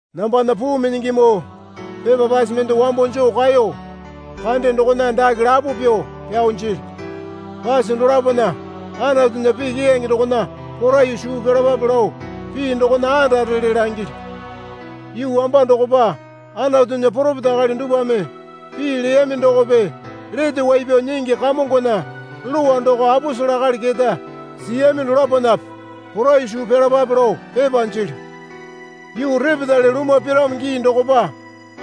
Nambana puu minyingimoo, pepa pase mende wambo joo kaeyo kande dokona dake lapo pyuo pyao jilyu. Pase dolapona Anatunya pii keyange dokona poraiyuo suu pyalapape lao pii dokona andarele langilyu. Yuu wamba dokopa Anatunya poropeta akali dupwame pii leyami dokope Lete Wai Pyao Nyingi Kamongona lowa doko aposele akali keta siyami dolaponape poraiyuo suu pyalapape lao pepa jilyu. Yuu repetale lumwa piramo gii dokopa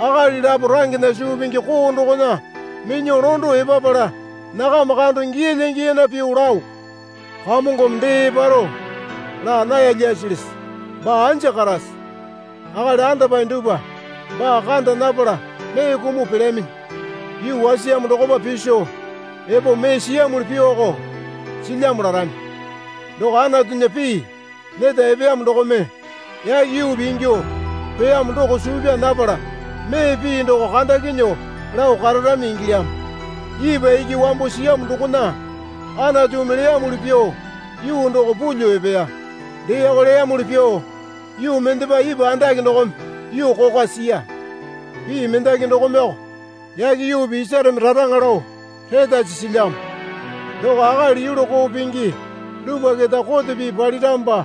akali lapo rangena suu pingi koo dokona minyuo londo epapala nakama kando giyalya giyana pyuo lao, Kamongome dee eparo laa naya lyasilisi? Baa anja karase? Akali andapae dupwa baa kanda napala mee kumuo pelyaminyi. Yuu wasiyamo dokopa piso epo mee siyamuli pyuoko silyamo larami. Doko Anatunya pii neta epeyamo dokome yake yuupi ingyuo peyamo doko suu pyaa napala mee pii doko kandakinyuo lao kararami ingilyamo. Ipwa iki wambo siyamo dokona Anatumi leyamuli pyuo yuu doko pulyuo epeya. Deeko leyamuli pyuo yuu mendepa ipwa andake dokome yuu kokwa siya. Pii mendaki dokomeyoko yake yuupi isareme raraŋa lao retasi silyamo. Doko akali yulu koo pingi dupwa keta kote pii paliramopa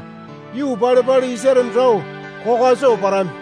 yuu pale pale isareme rao kokwa soo parami.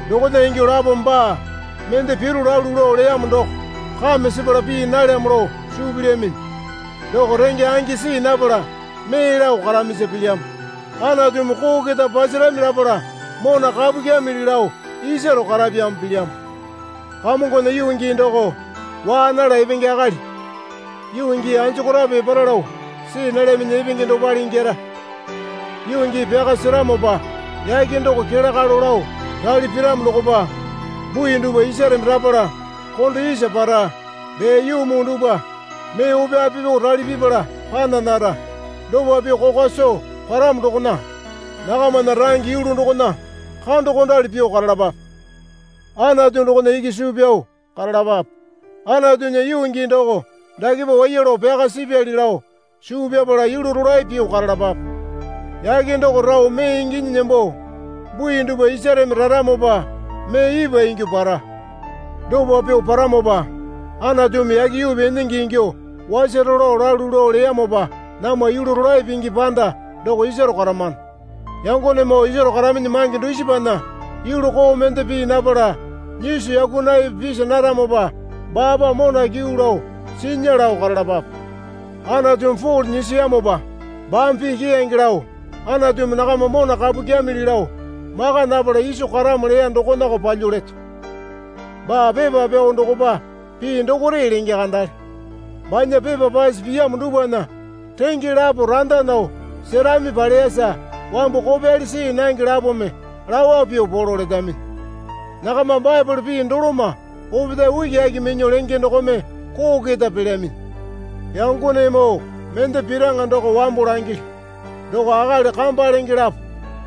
Dokona ingyuo lapome baa mende piro lalu lao leyamo doko kame sepala pii nalyamo lao suu pilyaminyi. Doko renge angi see napala mee lao karamisa pilyamo. Anatumi koo keta pasarami lapala mona kapu kyamili lao isaro karapyamo pilyamo. Kamongona yuu gii doko waa nala epenge akali yuu gii anjokorape epara lao see nalyaminyi epenge dopale ingyara. Yuu gii pyaka seramopa yake doko kele kalo lao rali piramo dokopa bui dupwa isareme rapala kondo isa para. Dee yuu muu dupwa mee ope ape pyuo rali pipala pana nara. Dopa pyuo kokwa soo paramo dokona nakamana range yulu dokona kandokondali pyuo karalapape. Anatu dokona iki suu pyao karalapape. Anatunya yuu gii doko dakepa waiya lao pyaka sipyali lao suu pyapala yulu rolae pyuo karalapape. Yake doko rao mee inginyi nembo, bui dupwa isareme raramopa mee ipwa ingyuo para. Dopa pyuo paramopa Anatumi yake yuupi enenge ingyuo wasaro lao lalu lao leyamopa namwa yulu rolae pingi panda doko isaro karamano. Yangonemoo isaro karaminyi mange dusipana yulu koo mende pii napala nyiso yakunaiyape pisa naramopa baapa mona kyuu lao sinya lao karalapape. Anatumi Pole nyisiyamopa baame pii keyange lao Anatumi nakama mona kapu kyamili lao maka napala iso karamo leya dokonako palyuo leto. Baa pepa pyao dokopa pii dokore lenge kandale. Banya pepa pase piyamo dupwana renge lapo randa nao serami paleyasa wambu kopyali see nange lapome lawa pyuo polo letaminyi. Nakama Baepole pii doloma opetae ukiaki minyuo lenge dokome koo keta pelyaminyi. Yangonemoo mende piraŋa doko wambo langilyu. Doko akali kamba lenge lapo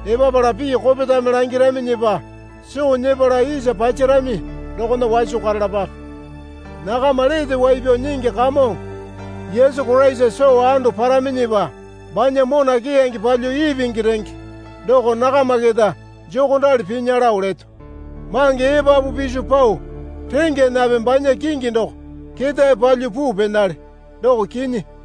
epapala pii kopetame langiraminyipa soo nyepala isa pasarami dokona waso karalapape. Nakama Lete Wai Pyao Nyingi Kamongo Yesu Koraisa soo ando paraminyipa banya mona keyange palyuo ipingi renge doko nakama keta jokondali pinya lao leto. Mange epapu piso pao rengyanape banya kingi doko ketae palyuo puu penale, doko kinyi.